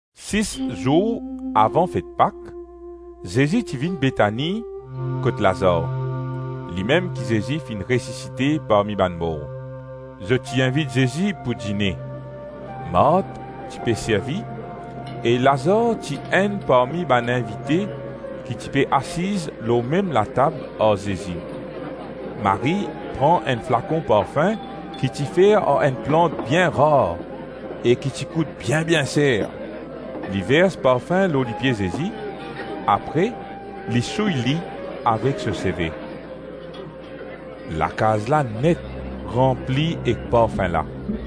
Sis zour avan fet Pak, Zezi ti vinn Betani kot Lazar, limem ki Zezi finn resisite parmi bann mor. Zot ti invit Zezi pou dine; Mart ti pe servi e Lazar ti enn parmi bann invite ki ti pe asiz lor mem latab ar Zezi. Marie pran enn flakon parfin ki ti fer ar enn plant bien rar e ki ti kout bien-bien ser; li vers parfin lor lipie Zezi, apre li souy li avek so seve. Lakaz la net ranpli ek parfin la.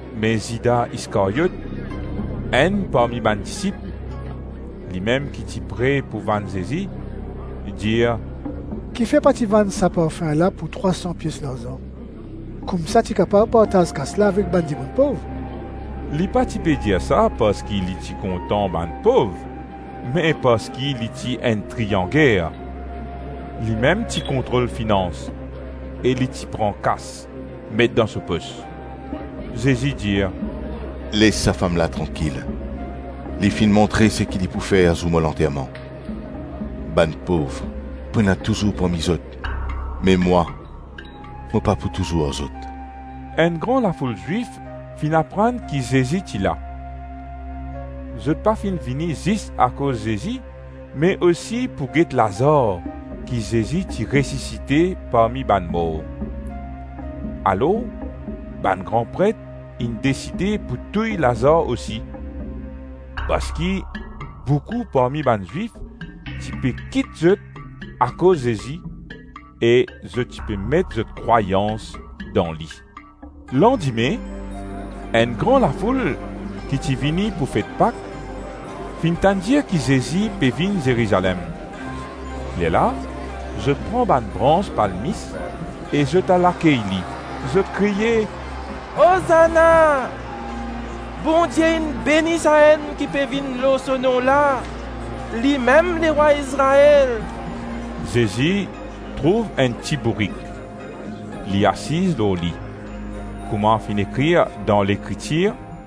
Me Zida Iskaryot, enn parmi bann disip, (limem ki ti pre pou vann Zezi), dir “Kifer pa ti vann sa parfin la pou trwa san pies larzan, koumsa ti kapav partaz kas la avek bann dimoun pov?” Li pa ti pe dir sa parski li ti kontan bann pov me parski li ti enn trianger; limem ti kontrol finans e li ti pran kas, met dan so pos. Zezi dir, “Les sa fam la trankil! Li finn montre seki li pou fer zour mo lanterman. Bann pov, pou ena touzour parmi zot me mwa mo pa pou touzour ar zot.” Enn gran lafoul Zwif finn aprann ki Zezi ti la. Zot pa finn vini zis akoz Zezi me osi pou get Lazar ki Zezi ti resisite parmi bann mor. Alors bann gran pret inn deside pou touy Lazar osi parski boukou parmi bann Zwif ti pe kit zot akoz Zezi, e zot ti pe met zot krwayans dan li. Landime, enn gran lafoul ki ti vini pou fet Pak, finn tann dir ki Zezi pe vinn Zerizalem. Lerla zot pran bann brans palmis e zot al akey li. Zot kriye, “Ozana, Bondie inn beni Sa-Enn ki pe vinn lor so nom la, limem lerwa Izrael.” Zezi trouv enn ti-bourik, li asiz lor li. Kouma finn ekrir dan Lekritir,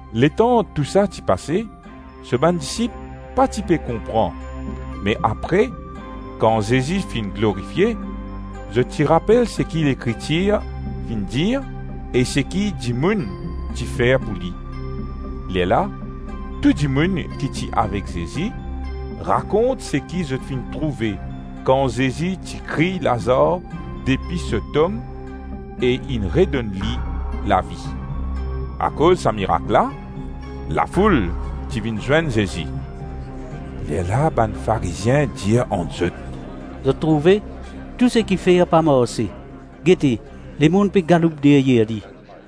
Letan tou sa ti pase, so bann disip pa ti pe konpran me apre, kan Zezi finn glorifie, zot ti rapel seki Lekritir finn dir e seki dimoun ti fer pou li. Lerla tou dimoun ki ti avek Zezi, rakont seki zot finn trouve kan Zezi ti kriy Lazar depi so tom e inn redonn li lavi. Akoz sa mirak la, lafoul ti vinn zwenn Zezi. Lerla bann Farizien dir ant zot, “Zot trouve, tou seki fer pa marse; gete, lemonn pe galoup deryer li.”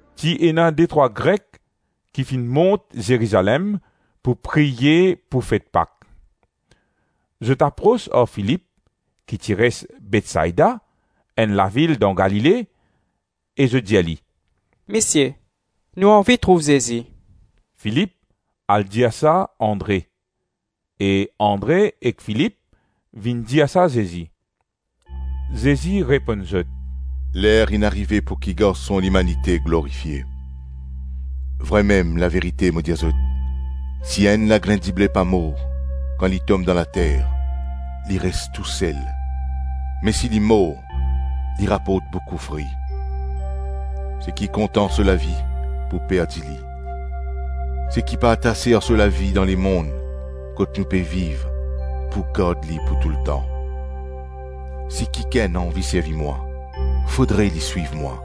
Ti ena detrwa Grek ki finn mont Zerizalem pou priye pou fet Pak. Zot apros ar Filip ki ti res Betsaida, enn lavil dan Galile, e zot dir li, “Misie, nou anvi trouv Zezi.” Filip al dir sa Andre e Andre ek Filip vinn dir sa Zezi. Zezi reponn zot, “Ler inn arive pouki Garson Limanite glorifie. Vremem, laverite mo dir zot, si enn lagrin dible pa mor kan li tom dan later, li res tou sel, me si li mor li raport boukou fri. Seki kontan so lavi pou perdi li, seki pa atase ar so lavi dan lemonn kot nou pe viv, pou gard li pou toultan. Si kikenn anvi servi mwa, fodre li swiv mwa;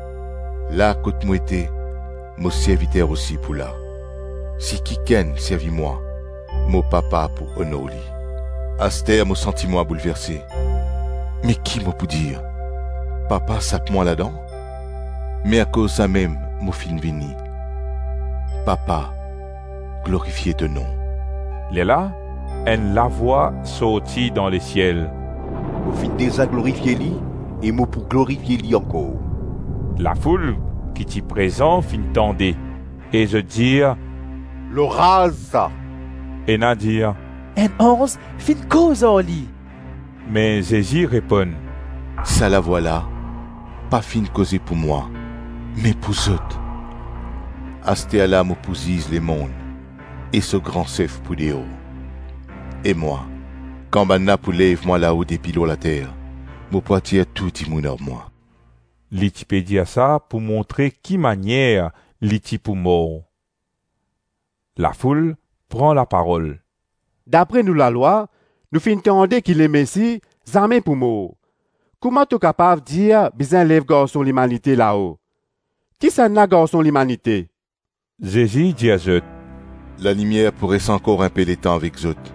la kot mo ete, mo serviter osi pou la; si kikenn servi mwa, mo Papa pou onor li.” “Aster mo santi mwa boulverse; me ki mo pou dir, ‘Papa sap mwa ladan?’ Me akoz samem mo finn vini.” “Papa, glorifie to nom.” Lerla enn lavwa sorti dan lesiel, “Mo finn deza glorifie li e mo pou glorifie li ankor.” Lafoul ki ti prezan finn tande e zot dir, “Loraz sa!” Ena dir, “Enn anz finn koz ar li!” Me Zezi reponn, “Sa lavwa la pa finn koze pou mwa me pou zot. Asterla mo pou ziz lemonn e so gran sef pou deor. E mwa, kan bannla pou lev mwa lao depi lor later, mo pou atir tou dimoun ar mwa.” Li ti pe dir sa pou montre ki manier li ti pou mor. Lafoul pran laparol, “Dapre nou lalwa nou finn tande ki Lemesi zame pou mor; kouma to kapav dir bizin lev Garson Limanite lao? Kisannla Garson Limanite?” Zezi dir zot, “Lalimier pou res ankor inpe letan avek zot;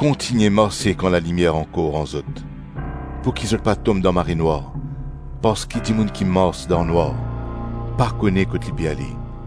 kontigne marse kan lalimier ankor ar zot, pouki zot pa tom dan marenwar; parski dimoun ki mars dan nwar, pa kone kot li pe ale.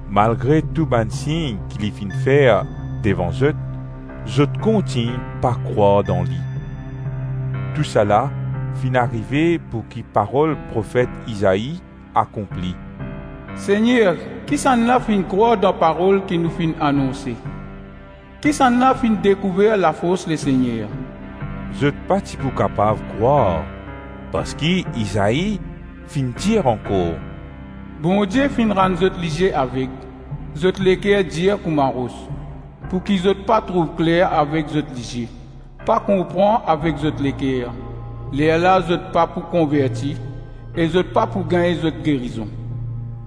Malgre tou bann sign ki li finn fer devan zot, zot kontign pa krwar dan li. Tousala finn arive pouki parol profet Izai akonpli, “Segner kisannla finn krwar dan parol ki nou finn anonse? Kisannla finn dekouver lafors Lesegner?” Zot pa ti pou kapav krwar parski Izai finn dir ankor, “Bondie finn rann zot lizie aveg, zot leker dir kouma ros, pouki zot pa trouv kler avek zot lizie, pa konpran avek zot leker, lerla zot pa pou konverti e zot pa pou gagn zot gerizon.”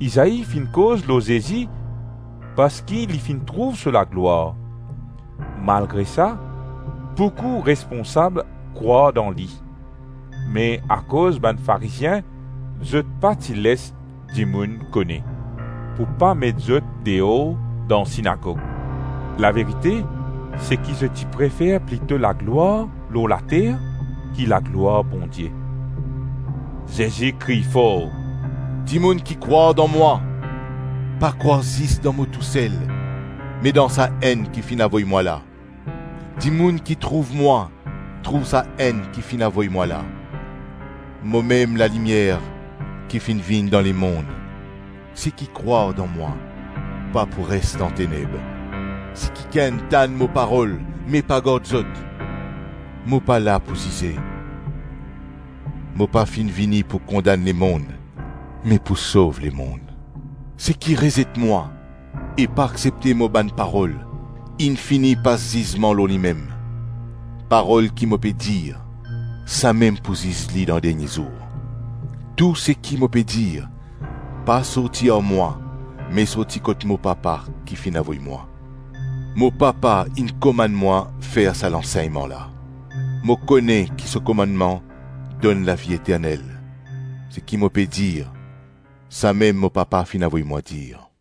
Izai finn koz lor Zezi parski li finn trouv so laglwar. Malgre sa, boukou responsab krwar dan li; me akoz bann Farizien, zot pa ti les dimoun kone, pou pa met zot deor dan sinagog. Laverite, seki zot ti prefer plito laglwar lor later ki laglwar Bondie. Zezi kriy for, “Dimoun ki krwar dan mwa, pa krwar zis dan mo tou sel me dan Sa-Enn ki finn avoy mwa la. Dimoun ki trouv mwa, trouv Sa-Enn ki finn avoy mwa la. Momem lalimier ki finn vinn dan lemonn. Seki krwar dan mwa, pa pou res dan teneb. Si kikenn tann mo parol me pa gard zot, mo pa la pou zize. Mo pa finn vini pou kondann lemonn me pou sov lemonn. Seki rezet mwa e pa aksepte mo bann parol, inn fini pas zizman lor limem. Parol ki mo pe dir, samem pou ziz li dan dernie zour. Tou seki mo pe dir, pa sorti ar mwa me sorti kot mo Papa ki finn avoy mwa. Mo Papa inn komann mwa fer sa lansegnman la. Mo kone ki so komannman donn lavi eternel; seki mo pe dir, samem mo Papa finn avoy mwa dir.”